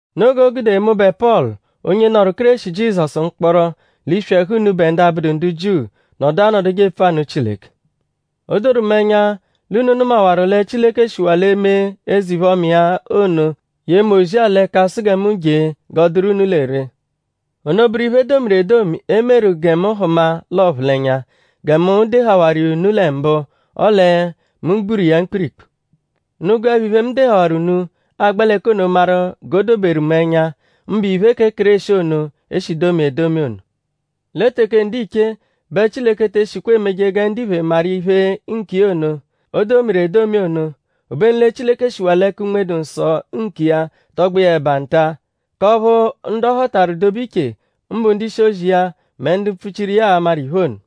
Noo g'o gude mụbe Pọlu, onye nọru Kéreshi Jizọsu mkpọro l'iswi ẹhu unubẹ ndu abụdu ndu Jiu; nọdu anọduje epfu anụ Chileke. O doru mu ẹnya l'unu nụmawaru lẹ Chileke shiwaa l'eme eze-iphe-ọma iya ono; ye mu ozi-a l'ẹka sụ gẹ mu jee; g'ọoduru unu lẹ ree. Ono bụru iphe, e domiru edomi e meru gẹ mu hụma l'ọphulenya. Gẹ mu dehaawaru iya unu lẹ mbụ; ọle mu gburu iya mkpirikpu. Unu -gụepho iphe, mu dehawaru; unu agbẹ l'ẹka ono maru g'o doberu mu ẹnya; mbụ iphe kẹ Kéreshi ono, e shi domia edomi ono. Lẹ teke ndiche bẹ Chileke te eshikwa emeje gẹ ndiphe maru iphe nkiya ono, o domiru edomi ono. Obenu lẹ Chileke shiwaa l'ẹka Unme-dụ-Nsọ nkiya tọgbo iya ẹba nta; k'ọphu ndu ọ họtaru dobe iche; mbụ ndu-ishi-ozi iya mẹ ndu mpfuchiru iya a-maru iphe ono.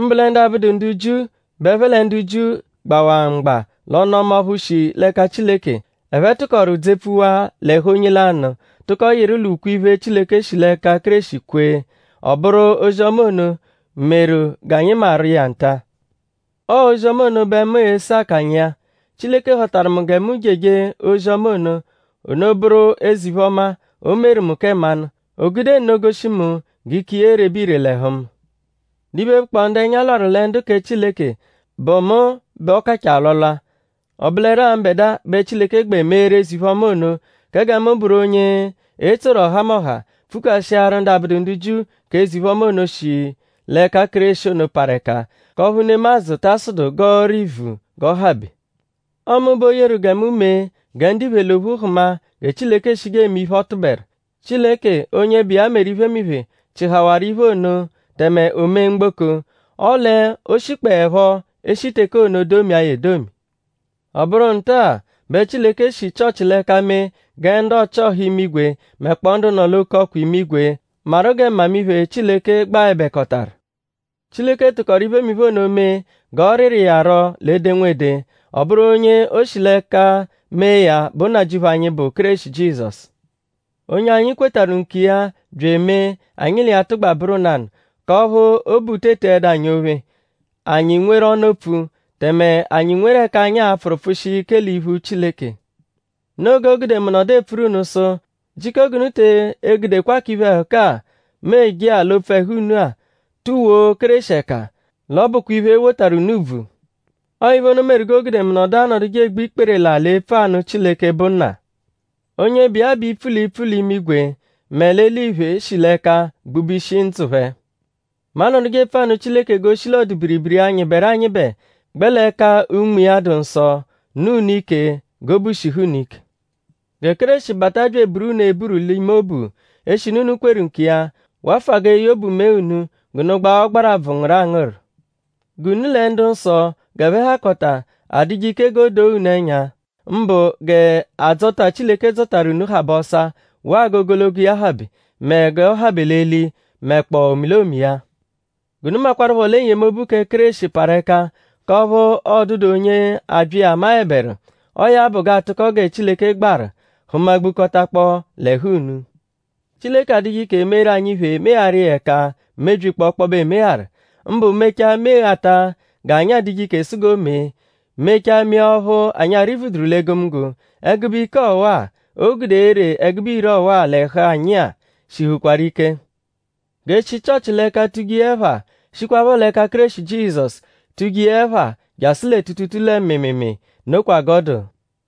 Mbụ lẹ ndu abụdu ndu Jiu bẹ ẹphe lẹ ndu Jiu gbawaa mgba l'ọnu-ọma ọphu shi l'ẹka Chileke. Ẹphe tụkoru dzepfuwaa l'ẹhu onye lanụ; tụko yịwaru l'ukwe-iphe, Chileke shi l'ẹka Kéreshi kwee. Ọ bụru ozi-ọma ono meru g'anyi maru iya nta. Ọo ozi-ọma ono bẹ mu ese akanya iya. Chileke họtaru mu gẹ mu jeje ozi-ọma ono; ono bụru eze-iphe-ọma, o meru mu kẹ mmanụ. O gude nno goshi mu g'ike iya erebe ire l'ẹhu mu. L'iphe, bụkpoo ndu ẹnya lwarụ lẹ ndu kẹ Chileke bụ mu bẹ ọ kachaa alwalwa; ọ bụleru mbẹdua-a bẹ Chileke gbẹ meeru eze-iphe-ọma ono kẹ gẹ mu bụru onye e-tsoru ọhamoha; pfukashiaru ndu abụdu ndu Jiu k'eze-iphe-ọma ono, shi l'ẹka Kéreshi ono parụ ẹka; k'ọphu nemadzụ ta asụdu g'ọo-rịvu g'ọ habe. Ọo mu bẹ o yeru gẹ mu mee gẹ ndiphe l'ophu hụma gẹ Chileke eshije eme iphe, ọ tụberu. Chileke onye bụ iya meru iphemiphe chịhawaru iphe ono; tẹme o mee mgboko; ọle o shikpọepho e -shi teke ono domia ya edomi. Ọ bụru nta-a bẹ Chileke shi Chịochi l'ẹka mee gẹ ndu ọchi-ọha imigwe; mẹkpoo ndu ọ-nọ-l'oke-ọkwa imigwe maru gẹ mmamiphe Chileke gbaẹbekotaru. Chileke tụkoru iphemiphe ono mee g'ọ rịru iya rọ l'edenwede. Ọ bụru onye o shi l'ẹka mee ya bụ Nnajịuphu anyi, bụ Kéreshi Jizọsu; onye anyi kwetarụ nkiya bya emee; anyi l'iya tụgba bụru nanụ; k'ọphu obu te eteẹdu anyi ophe; anyi nweru ọnu-opfu; tẹme anyi nweru ẹka anyi a-pfụru pfụshia ike l'iphu Chileke. Noo g'o gude mu nọdu epfuru unu sụ: jiko g'unu te egudekwa k'iphe-ẹhuka-a, mu eje l'opfu ẹhu unu-a; tuwoo Kéreshi ẹka; l'ọ bụkwa iphe e-wotaru unu ùbvù. Ọo iphe ono meru g'o gude mu nọdu anọduje egbu ikpere l'alị epfu anụ Chileke, bụ Nna; onye bụ iya bẹ ipfu l'ipfu l'imigwe mẹ l'eliphe shi l'ẹka gbube ishi ndzụ phẹ. Mu anọduje epfu anụ Chileke g'o shi l'ọdu-biribiri iya, nyịberu anyịbe gbẹ l'ẹka Unme iya, dụ Nsọ; nụ unu ike g'obu shihu unu ike; gẹ Kéreshi bata bya eburu unu eburu l'ime obu; eshinu unu kweru nkiya; wafụa g'eye obu mee unu g'unu gbaa ọgbarabvu ngụru angụru; g'unu lẹ ndu-nsọ g'ẹphe hakọta adụje ike g'o doo unu ẹnya; mbụ gẹ adzọta, Chileke dzọtaru unu habe ọsa; waa g'ogologo iya habe; mẹ g'ọ habe l'eli; mẹkpoo omilomi iya; g'unu makwaruphọ lẹ n-yemobu kẹ Kéreshi parụ ẹka; k'ọphu ọ dụdu onye abya iya amaẹberu. Ọo ya bụ g'aatụko gẹ Chileke gbaru; hụmagbukotakpoo l'ẹhu unu. Chileke adụje ike meeru anyi iphe megharụ iya ẹka mebyikpọo ọkpobe emegharu; mbụ mechaa meghata g'anyi adụje ike sụ g'o mee; mechaa mee ọphu anyi arị-vuduru l'egomunggo. Ẹgube ike ọwa-a, o gude ere ẹgube ire ọwa-a l'ẹhu anyi-a shihukwaru ike. G'e shi Chịochi l'ẹka tuje iya ẹpha; shikwaphọ l'ẹka Kéreshi Jizọsu tuje iya ẹpha jasụ lẹ tuutuutuu lẹ mịimiimii. Nokwa g'ọ dụ.